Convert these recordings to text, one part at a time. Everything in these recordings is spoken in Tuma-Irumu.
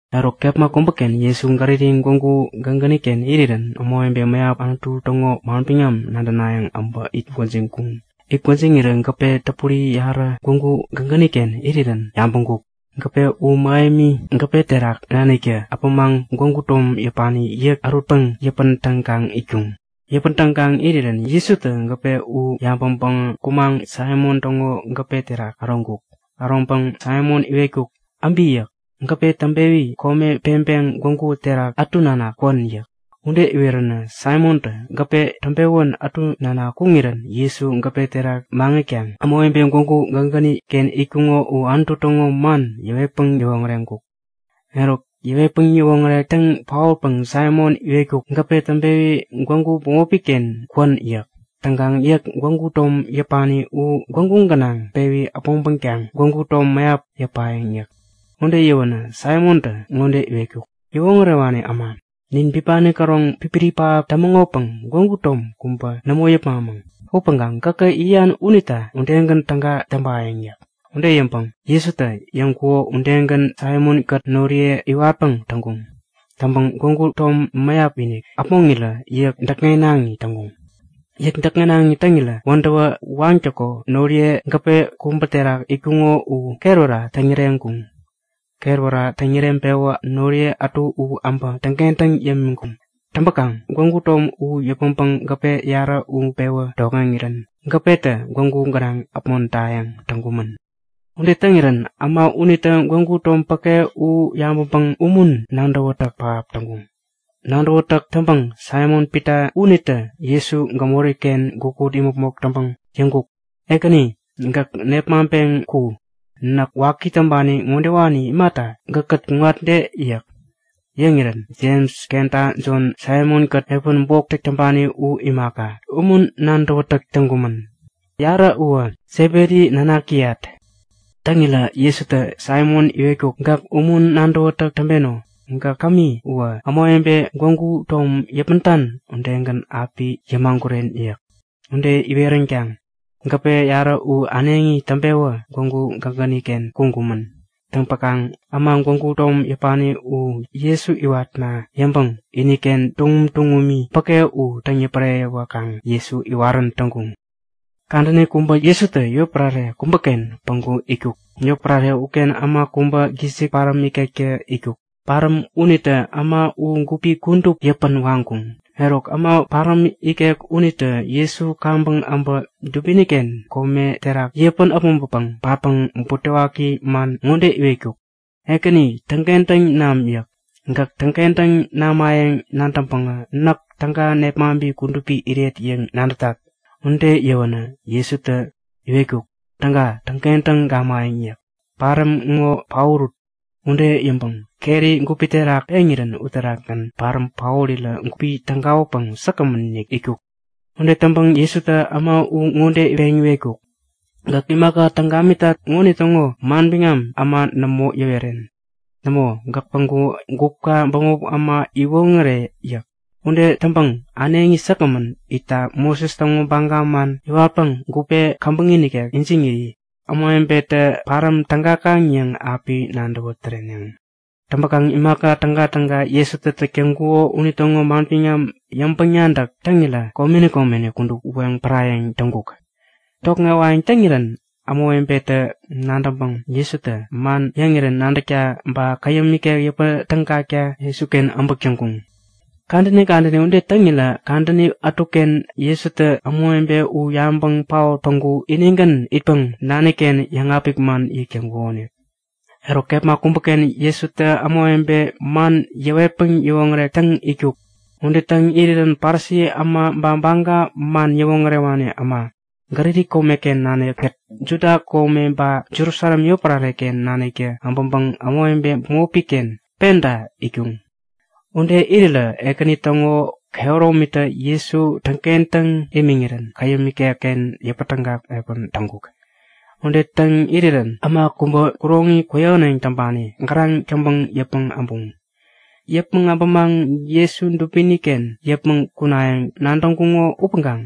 Eruk kepma kubäken Jesu Galili gwägu gägäni-ken irirän ämawebe mäyap Anutu täŋo manbiŋam nadänayäŋ äbä it gwäjiŋkuŋ. It gwäjiŋirä gäpe täpuri yarä gwägu gägäni-ken irirän yabäŋkuk. Gäpe u mähemi gäpe terak naniktä äpämaŋ gwägu tom yäpani yäk ärutpäŋ yäpätägaŋ itkuŋ. Yäpätägaŋ irirä Jesutä gäpe u yabäŋpäŋä kumaŋ Saimon täŋo gäpe uterak äroŋkuk. Äroŋpäŋ Saimon iwetkuk; Äbi yäk. Gäpe täŋpewi kome peŋpeŋ gwägu terak ätu nanak kwän yäk. Ude iweränä Saimontä gäpe täŋpewän ätu nanak kuŋirän Jesu gäpe terak maŋitkaŋ ämawebe gwägu gägäni-ken itkuŋo u Anutu täŋo man yäwetpäŋ yäwoŋäreŋkuk. Eruk yäwetpäŋ yäwoŋärek täŋ paotpäŋä Saimon iwetkuk; Gäpe täŋpewi gwägu bämopi-ken kwän yäk. Täŋkaŋ yäk, gwägu tom yäpani u gwägu gänaŋ pewi äpmoŋpäkaŋ gwägu tom mäyap yäpayäŋ yäk. Ude yäwänä Saimontä ŋode iwetkuk; Yäwoŋärewani äma, nin bipani käroŋ pipiri pähap tämäŋopäŋ gwägu tom kubä nämo yäpmamäŋ. Upäŋkaŋ gäkä yäyan unita udegän täga täŋpayäŋ yäk. Ude yäŋpäŋ Jesutä yäŋkuko udegän Saimon-kät noriye iwatpäŋ täŋkuŋ. Täŋpäŋ gwägu tom mäyap-inik äpmoŋirä yäk däkŋenaŋi täŋkuŋ. Yäk däkŋenaŋi täŋirä wädäwä waŋtäko noriye gäpe kubä terak itkuŋo u ketwära täŋyäreŋkuŋ. Ketwära täŋyäreŋpewä noriye ätu u äbä täŋkentäŋ yämiŋkuŋ. Täŋpäkaŋ gwägu tom u yäpmäŋpäŋ gäpe yarä u pewä tokŋeŋirän gäpetä gwägu gänaŋ äpmodayäŋ täŋkumän. Ude täŋirän äma unitä gwägu tom päke u yabäŋpäŋ umun nadäwätäk pähap täŋkuŋ. Nadäwätäk täŋpäŋ Saimon-Pita unitä Jesu gämori-ken gukut imäpmok täŋpäŋ yäŋkuk; Ekäni! Gäk nepmaŋpeŋ ku! Näk waki täŋpani ŋodewani imata gäkkät kuŋatde? yäk. Yäŋirän Jems kenta Jon, Saimon-kät piä bok täŋpani u imaka, umun nadäwätäk täŋkumän. Yarä uwä Sebedi nanakiyat. Täŋirä Jesutä Saimon iwetkuk; Gäk umun nadäwätäk täŋpeno. Gäk kämi uwä, ämawebe gwägu tom yäpmäŋtan udegän api yämaguren yäk. Ude iweränkaŋ gäpe yarä u äneŋi täŋpewä gwägu gägäni-ken kuŋkumän. Täŋpäkaŋ äma gwägu tom yäpani u Jesu iwatna yäŋpäŋ iniken tuŋum tuŋumi päke u täŋ-yäpäreyäwäkaŋ Jesu iwarän täŋkuŋ. Kadäni kubä Jesutä yotpärare kubäken päŋku itkuk. Yotpärare uken äma kubä gisik paräm ikektä itkuk. Paräm unitä äma u gupi kudup yäpän waŋkuŋ. Eruk, äma paräm ikek unitä Jesu kaŋpäŋ äbä dubini-ken kome terak yäpän äpmoŋpäpäŋ patkaŋ butewaki man ŋode iwetkuk; Ekäni, täŋkentäŋ nam yäk. Gäk täŋkentäŋ namayäŋ nadäŋpäŋä näk täga nepmaŋpi kudupi iret yäŋ nadätat. Ude yäwänä Jesutä iwetkuk; Täga täŋkentäŋ gamayäŋ yäk. Paräm ŋo paorut! Ude yäŋpäŋ keri gupi terak peŋirän uterakgän paräm paorirä gupi tägawänpäŋ säkgämän itkuk. Ude täŋpäŋ Jesutä äma u ŋode peŋ iwetkuk; Gäk imaka täŋ gamitat ŋonitäŋo manbiŋam äma nämo yäweren. Nämo, gäk päŋku gupka bämop äma iwoŋäre yäk. Ude täŋpäŋ äneŋi säkgämän itta Moses täŋo baga man iwatpäŋ gupe käbäŋi nikek ijiŋiri ämawebetä paräm tägakaŋ yäŋ api nadäwä täreneŋ. Täŋpäkaŋ imaka tägatäga Jesutä täk täŋkuko unitäŋo manbiŋam yäŋpäŋ-nadäk täŋirä komeni komeni kudup weŋ parayäŋ täŋkuk. Tokŋewayäŋ täŋirän ämawebetä nadäŋpäŋ Jesutä man yäŋirän nadäkta ba käyäm ikek yäpä tägakta Jesuken äbäk täŋkuŋ. Kadäni kadäni ude täŋirä kadäni ätuken Jesutä ämawebe u yabäŋ paot päŋku inigän itpäŋ nani-ken yäŋapik man yäk täŋkukonik. Eruk kepma kubäken Jesutä ämawebe man yäwetpäŋ yäwoŋärek täŋ itkuk. Ude täŋ irirän Parisi äma ba Baga man yäwoŋärewani äma, Galili komeken nanikkät Judia kome ba Jerusalem yotpärare-ken naniktä äbäŋpäŋ ämawebe bämopi-ken penta itkuŋ. Ude irirä Ekäni täŋo kehäromitä Jesu täŋkentäŋ imiŋirän käyäm ikekken yäpätägak piä täŋkuk. Ude täŋ irirän äma kubä kuroŋi kwäyähäneŋ täŋpani gäraŋ täŋpäŋ yäpmäŋ äbuŋ. Yäpmäŋ äbämaŋ Jesu dubini-ken yäpmäŋ kunayäŋ nadäŋkuŋo upäŋkaŋ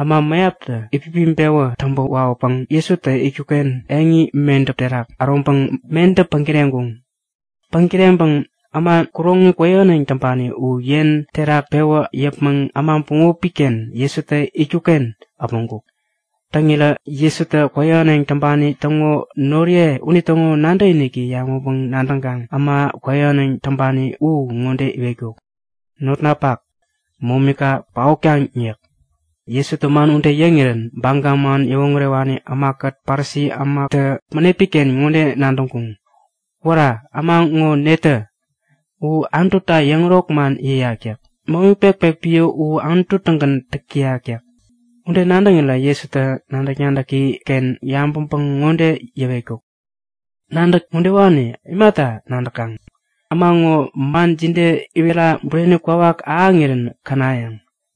äma mäyaptä itpipiŋpewä täŋpä wawäpäŋ Jesutä itkuk-ken eŋi medäp terak äroŋpäŋ medäp päŋ-kireŋkuŋ. Päŋ-kireŋpäŋ äma kuroŋi kwäyähäneŋ täŋpani u yen terak pewä yäpmäŋ äma bämopi-ken Jesutä itkuk-ken äpmoŋkuk. Täŋirä Jesutä kwäyähäneŋ täŋpani täŋo noriye unitäŋo nadäkiniki yabäŋpäŋ-nadäŋkaŋ äma kwäyähäneŋ täŋpani u ŋode iwetkuk; Notnapak, momika paotkaŋ yäk. Jesutä man ude yäŋirän Baga man yäwoŋärewani ämakät Parisi ämatä bänepi-ken ŋode nadäŋkuŋ; Wära! Äma ŋo netä? U Anututa yäŋärok man yäyak yäk. Momi pekpek piä u Anutu-tägän täk täyak. Ude nadäŋirä Jesutä nadäk-nadäki-ken yabäŋpäŋ ŋode yäwetkuk; Nadäk udewani imata nadäkaŋ? Äma ŋo man jide iwerira bureni kwawak ahäŋirän känayäŋ?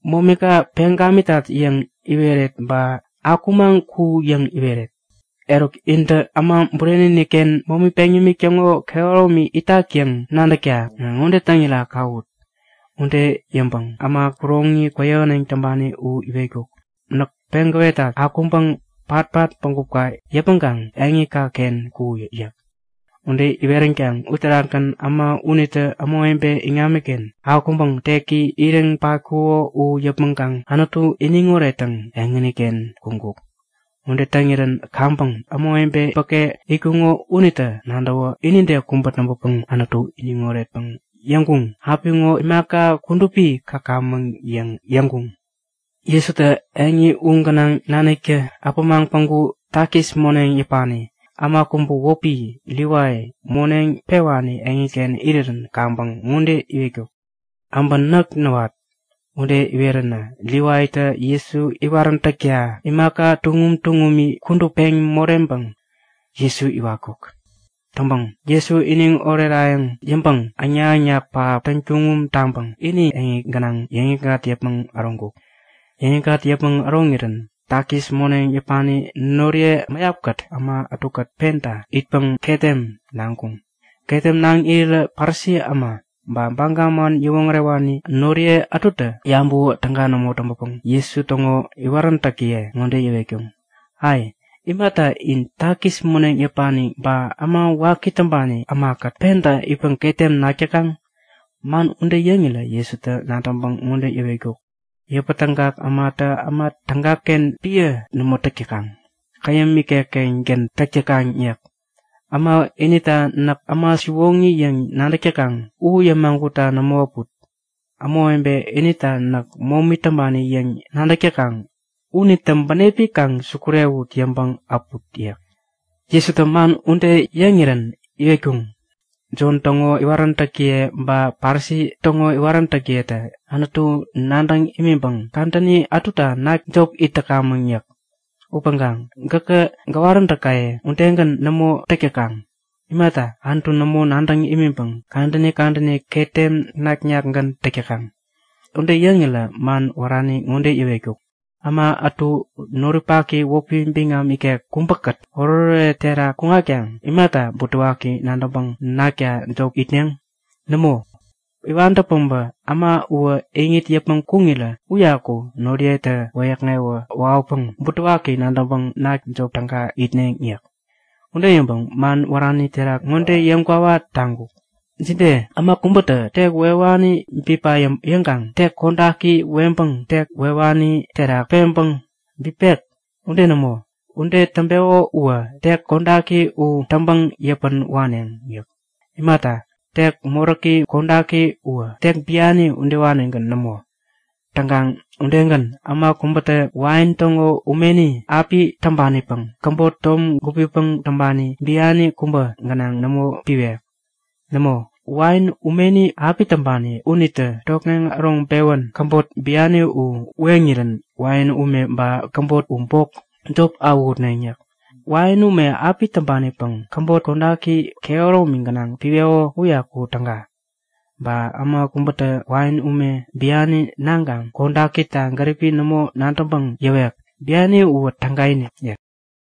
Momika peŋ gamitat yäŋ iweret ba Akumaŋ ku yäŋ iweret? Eruk, intä Äma Bureni-inik-ken momi peŋ yämik täŋo kehäromi itak yäŋ nadäkta ŋode täŋira kawut. Ude yäŋpäŋ äma kuroŋi kwäyähäneŋ täŋpani u iwetkuk; Näk peŋ gäwetat; Akuŋkaŋ patpat bägupka yäpmäŋkaŋ eŋika-ken kuyi! yäk. Ude iweränkaŋ uterakgän äma unitä ämawebe iŋamiken akumaŋ teki iriŋ patkuko u yäpmäŋkaŋ Anutu iniŋ orettäŋ eŋini-ken kuŋkuk. Ude täŋirän kaŋpäŋ ämawebe päke itkuŋo unitä nadäwä inide kubä täŋpäpäŋ Anutu iniŋ oretpäŋ yäŋkuŋ; Apiŋo imaka kudupi käkamäŋ! yäŋ yäŋkuŋ. Jesutä eŋi u gänaŋ naniktä äpämaŋ päŋku takis moneŋ yäpani äma kubä wäpi Livai moneŋ pewani eŋiken irirän kaŋpäŋ ŋode iwetkuk; Äbä näk näwat! Ude iweränä Livaitä Jesu iwaräntäkta imaka tuŋum tuŋumi kudup peŋ moreŋpäŋ Jesu iwatkuk. Täŋpäŋ Jesu iniŋ orerayäŋ yäŋpäŋ äŋnak-äŋnak pähap täŋtuŋum taŋpäŋ ini eŋi gänaŋ yäŋikŋat yäpmäŋ äroŋkuk. Yäŋikŋat yäpmäŋ äroŋirän takis moneŋ yäpani noriye mäyapkät äma ätukät penta itpäŋ ketem naŋkuŋ. Ketem naŋ irirä Parisi äma ba Baga man yäwoŋärewani noriye ätutä yabäwä täga nämo täŋpäpäŋ Jesu täŋo iwaräntäkiye ŋode yäwetkuŋ; Ai! Imata in takis moneŋ yäpani ba äma waki täŋpani ämakät penta itpäŋ ketem nak täkaŋ? Man ude yäŋirä Jesutä nadäŋpäŋ ŋode yäwetkuk; Yäpätägak ämatä äma tägaken piä nämo täk täkaŋ. Käyäm ikek-kengän täk täkaŋ yäk. Äma inita näk äma siwoŋi yäŋ nadäk täkaŋ u yämagutta nämo äput. Ämawebe inita näk momi täŋpani yäŋ nadäk täkaŋ unitä bänepi kaŋ sukurewut yäŋpäŋ äput yäk. Jesutä man ude yäŋirän iwetkuŋ; Jon täŋo iwaräntäkiye ba Parisi täŋo iwaräntäkiyetä Anutu nadäŋ imiŋpäŋ kadäni ätuta nakta jop it täkamäŋ yäk. Upäŋkaŋ gäkŋo gäwaräntäkaye udegän nämo täk täkaŋ. Imata Anutu nämo nadäŋ imiŋpäŋ kadäni kadäni ketem nak-nakgän täk täkaŋ? Ude yäŋirä man wärani ŋode yäwetkuk; Äma ätu noripaki wäpi biŋam ikek kubäkät oretoret terak kuŋatkaŋ imata butewaki nadäŋpäŋ nakta jop itneŋ? Nämo! Iwantä päbä äma uwä iŋit yäpmäŋ kuŋirä uyaku noriyetä wäyäkŋewä wawäpäŋ butewaki nadäŋpäŋ nakta jop täga itneŋ yäk. Ude yäŋpäŋ man wärani terak ŋode yäŋ kwawa taŋkuk; Jide? Äma kubätä tek wewani bipa yäŋkaŋ tek kodaki weŋpäŋ tek wewani terak peŋpäŋ bipek? Ude nämo! Ude täŋpeko uwä tek kodaki u täŋpäŋ yäpän waneŋ yäk. Imata, tek moräk kodaki uwä tek biani udewanigän nämo. Täŋkaŋ udegän, äma kubätä wain täŋo umeni api täŋpanipäŋ käbot tom gupipäŋ täŋpani biani kubä gänaŋ nämo piwek. Nämo, wain umeni api täŋpani unitä tokŋeŋ äroŋpewän käbot biani u weŋirän wain ume ba käbot u bok jop awähutneŋ yäk. Wain ume api täŋpanipäŋ käbot kodaki kehäromi gänaŋ piweko uyaku täga. Ba äma kubätä wain ume biani naŋkaŋ kodakita gäripi nämo nadäŋpäŋ yäwek; Biani uwä tägainik yäk.